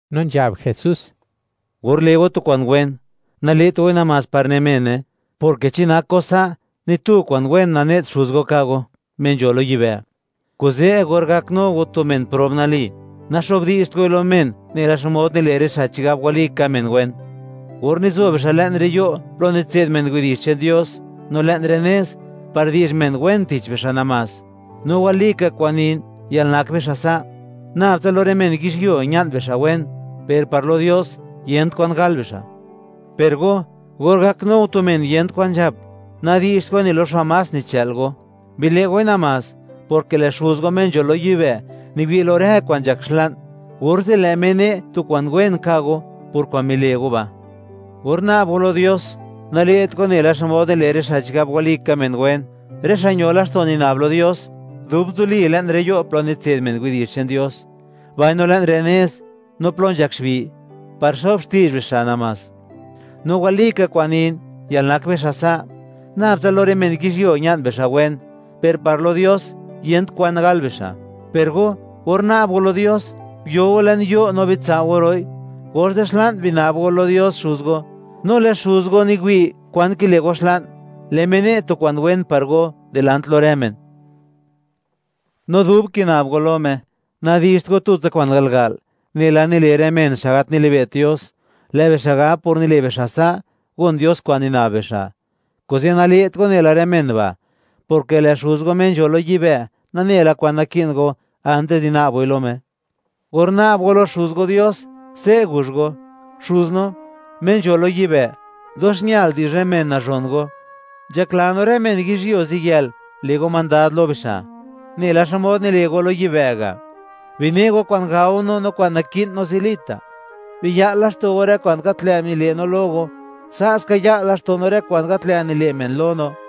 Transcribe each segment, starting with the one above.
No nzhab Jesús: ―Or le' go tu kwa'n wen, nale't goi namás par ne mene, porke chi nak go sa', ni tu kwa'n wen nane't Xuz go ka' go, Me nzho lo yibë'. Kuze' or gaknu go tu men prob nali, naxo'bdi'zht goi lo men, nela xmod nile' rë xa' chigab walika men wen, or nizo bixa' le'n rë yo' plo nitse'd men widi'zh che'n Dios, no le'n rë nez, par di'zh men wen tich bixa' namás. No walika kwa'n nin, yalnak bixa' sa', nab tsa lo rë men yizhyuo ña'n bixa' wen, per par lo Dios, yent kwan gal bixa'. Per go, or gaknu go tu men yent kwan nzhap, nadi'zht goi ni lo xa' más nichë'l go; bile' goi namás, porke lë' Xuz go Me nzho lo yibë', niwi' lo rë kwa'n nzhak xla'n, orze' lë' Me ne' tu kwa'n wen ka' go, por kwa'n mile' go ba'. ’Or na'b go lo Dios, nale't go nela xmod nile' rë xa' chigab walika men wen, rë xa' ño laxto' nina'b lo Dios, dub nzoli le'n rë yo' plo nitse'd men widi'zh che'n Dios, mbaino le'n rë nez, no plo nzhak xbi', par xo'b xti'zh bixa' namás. No walika kwa'n nin, yalnak bixa' sa', nab tsa lo rë men yizhyuo ña'n bixa' wen, per par lo Dios, yent kwan gal bixa'. Per go, or na'b go lo Dios, guyo go le'n yo', no bitsao' go ro'i, orze' xla'n bina'b go lo Dios Xuz go; no lë' Xuz go niwi' kwa'n kile' go xla'n, lë' Me ne' tu kwa'n wen par go dilant lo rë men. No dub kina'b go lo Me, nadi'zht go tutsa kwa'n garga'l, nela nile' rë men, xa' gat nilibe't Dios. Lë' bixa' gab, por nile' bixa' sa', gon Dios kwa'n nina'b bixa'. Kuze' nale't go nela rë men ba', porke lë' Xuz go, Me nzho lo yibë', nane la kwan naki'n go, antis di na'b goi lo Me. Or na'b go lo Xuz go Dios, se' guzh go: Xuz no, Me nzho lo yibë', dox ñal di'zh rë men, nazhon Go; nzhakla no, rë men yizhyuo ziyël le' Go mandad lo bixa', nela xmod nile' Go lo yibë' ga'; bine' Go kwa'n gao no, no kwa'n naki'n no zilita'; biya'l laxto' Go rë kwa'n gat lë' nile' no lo Go; sa' ska ya'l laxto' no rë kwa'n gat lë' nile' men lo no.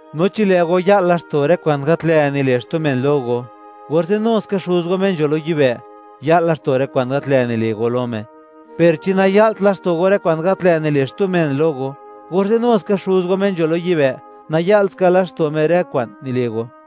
’No chi lë' go ya'l laxto' rë kwa'n gat lë' nile' xtu men lo go, orze' nu ska Xuz go Me nzho lo yibë', ya'l laxto' rë kwa'n gat lë' nile' go lo Me, per chi naya'lt laxto' go rë kwa'n gat lë' nile' xtu men lo go, orze' nu ska Xuz go Me nzho lo yibë', naya'lt ska laxto' Me rë kwa'n nile' go.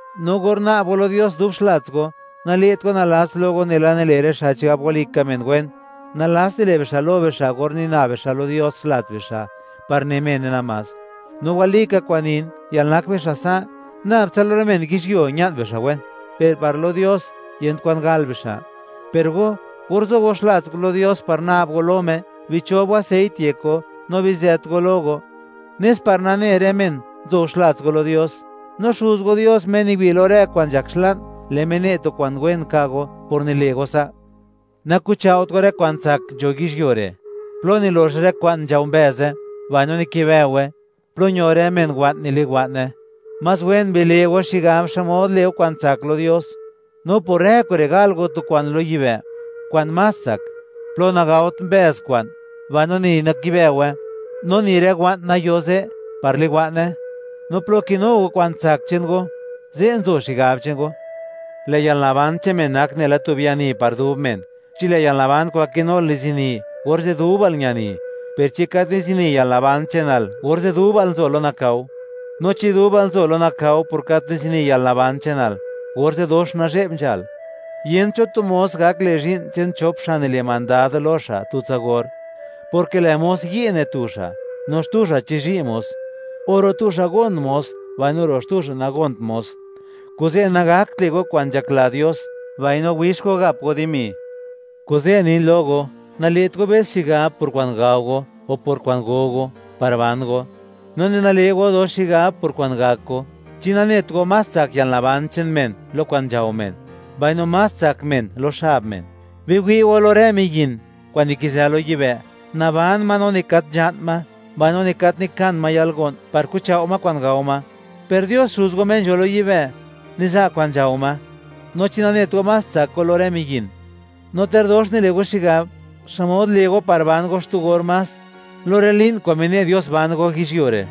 ’No or na'b go lo Dios dub xlats go; nale't go nalats lo go nela nile' rë xa' chigab walika men wen; nalats nile' bixa' lo bixa' or nina'b bixa' lo Dios xlats bixa' par ne mene namás. No walika kwa'n nin, yalnak bixa' sa', nab tsa lo rë men yizhyuo ña'n bixa' wen, per par lo Dios, yent kwan gal bixa'. Per go, or zo go xlats go lo Dios par na'b go lo Me, bichob go aseit yek go no bizët go lo go, nes par nane rë men, nzo go xlats go lo Dios; no Xuz go Dios Me niwi' lo rë kwa'n nzhak xla'n; lë' Me ne' tu kwa'n wen ka' go por nile' go sa'. ’Naku'chao't go rë kwa'n tsak nzho yizhyuo re', plo nilox rë kwa'n nzhao mbëze, mbaino nikibëowe, plo ño rë men wa'n, niliwa'ne; más wen bile'o xigab xmod le'o kwa'n tsak lo Dios, no por rë kure' gal go tu kwa'n lo yibë' kwa'n más tsak, plo nagaot mbëz kwa'n, mbaino ni nakibëowe, no ni rë wa'n nayo ze' par liwa'ne. No plo kinu go kwa'n tsak che'n go, ze' nzo xigab che'n go. ’Lë' yalnaban che'n men nak nela tu biani par dub men. Chi lë' yalnaban kwa'n kinul nizini, orze' dubal ñani; per chi gat nizini yalnaban che'nal, orze' dubal nzo lo nakao; no chi dubal nzo lo nakao por gat nizini yalnaban che'nal, orze', ¡dox nazhe'b nzhal! ’Yent cho tu mos gak le' zhi'n che'n chop xa' nile' mandad lo xa' tutsa or; porke lë' mos yi' ne tu xa', no xtu xa' chizhi' mos; o ro' tu xa' gon mos, mbaino ro' xtu xa' nagont mos. Kuze', nagakt le' go kwa'n nzhakla Dios, mbaino wix go gap go dimi. ’Kuze' nin lo go: Nale't go be's xigab por kwa'n gao go, o por kwa'n go go par ban go; no ni nale' go dox xigab por kwa'n gak go. ¿Chi nanet go, más tsak yalnaban che'n men lo kwa'n nzhao men, mbaino más tsak men lo xab men? Biwi' go lo rë miyin kwa'n nikizë lo yibë'; naban ma no ni gat nzha'n ma, mbaino ni gat nikan ma yalgo'n, par kuchao' ma kwa'n gao ma; per Dios Xuz go Me nzho lo yibë', niza' kwa'n nzhao ma. No, ¿chi nanet go, más tsak go lo rë miyin? No ter dox nile' go xigab, ¿xmod le' go par ban go xtu or más lo rë li'n, kwa'n mine' Dios ban go yizhyuo re'?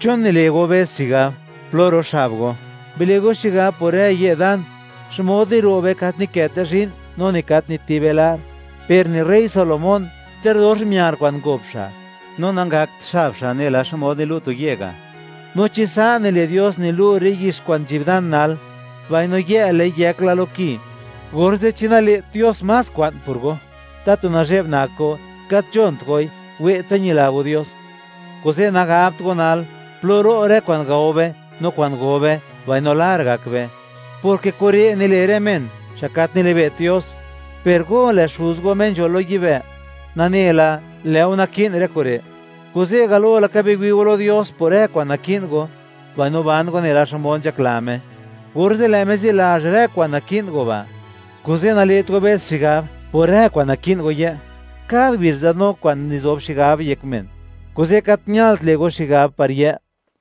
’¿Chon nile' go be's xigab plo ro' xab go? Bile' go xigab por rë ye' dan, xmod niro'be: Gat nikëte zhi'n, no ni gat nitibe lar. Per ni rey Salomón, ter dox miar kwa'n ngop xa', no nangakt xab xa' nela xmod nilu' tu ye' ga'. No chi sa' nile' Dios nilu' rë yix kwa'n nzhi'b dan nal, mbaino yë', lë'i yëk la lo ki, orze', ¿chi nale't Dios más kwa'n por go? Tatu nazhe'b nak go, gat nzhont goi, we'tsa ñila go Dios. Kuze', nagabt go nal: “¿Plo ro' kwa'n gao be no kwa'n go be, mbaino lar gak be?”, porke kure' nile' rë men, xa' gat nili'be't Dios; per go, lë' Xuz go Me nzho lo yibë', nane la, lë' go naki'n rë kure'. Kuze' galo laka biwi' go lo Dios por rë kwa'n naki'n go, mbaino ban go nela xmod nzhakla Me, orze' lë' Me zilazh rë kwa'n naki'n go ba'. Kuze' nale't go be's xigab por rë kwa'n naki'n go yë'. Kad ngubizh nzadnu kwa'n nizob xigab yek men, kuze' gat ñalt le' go xigab par yë'.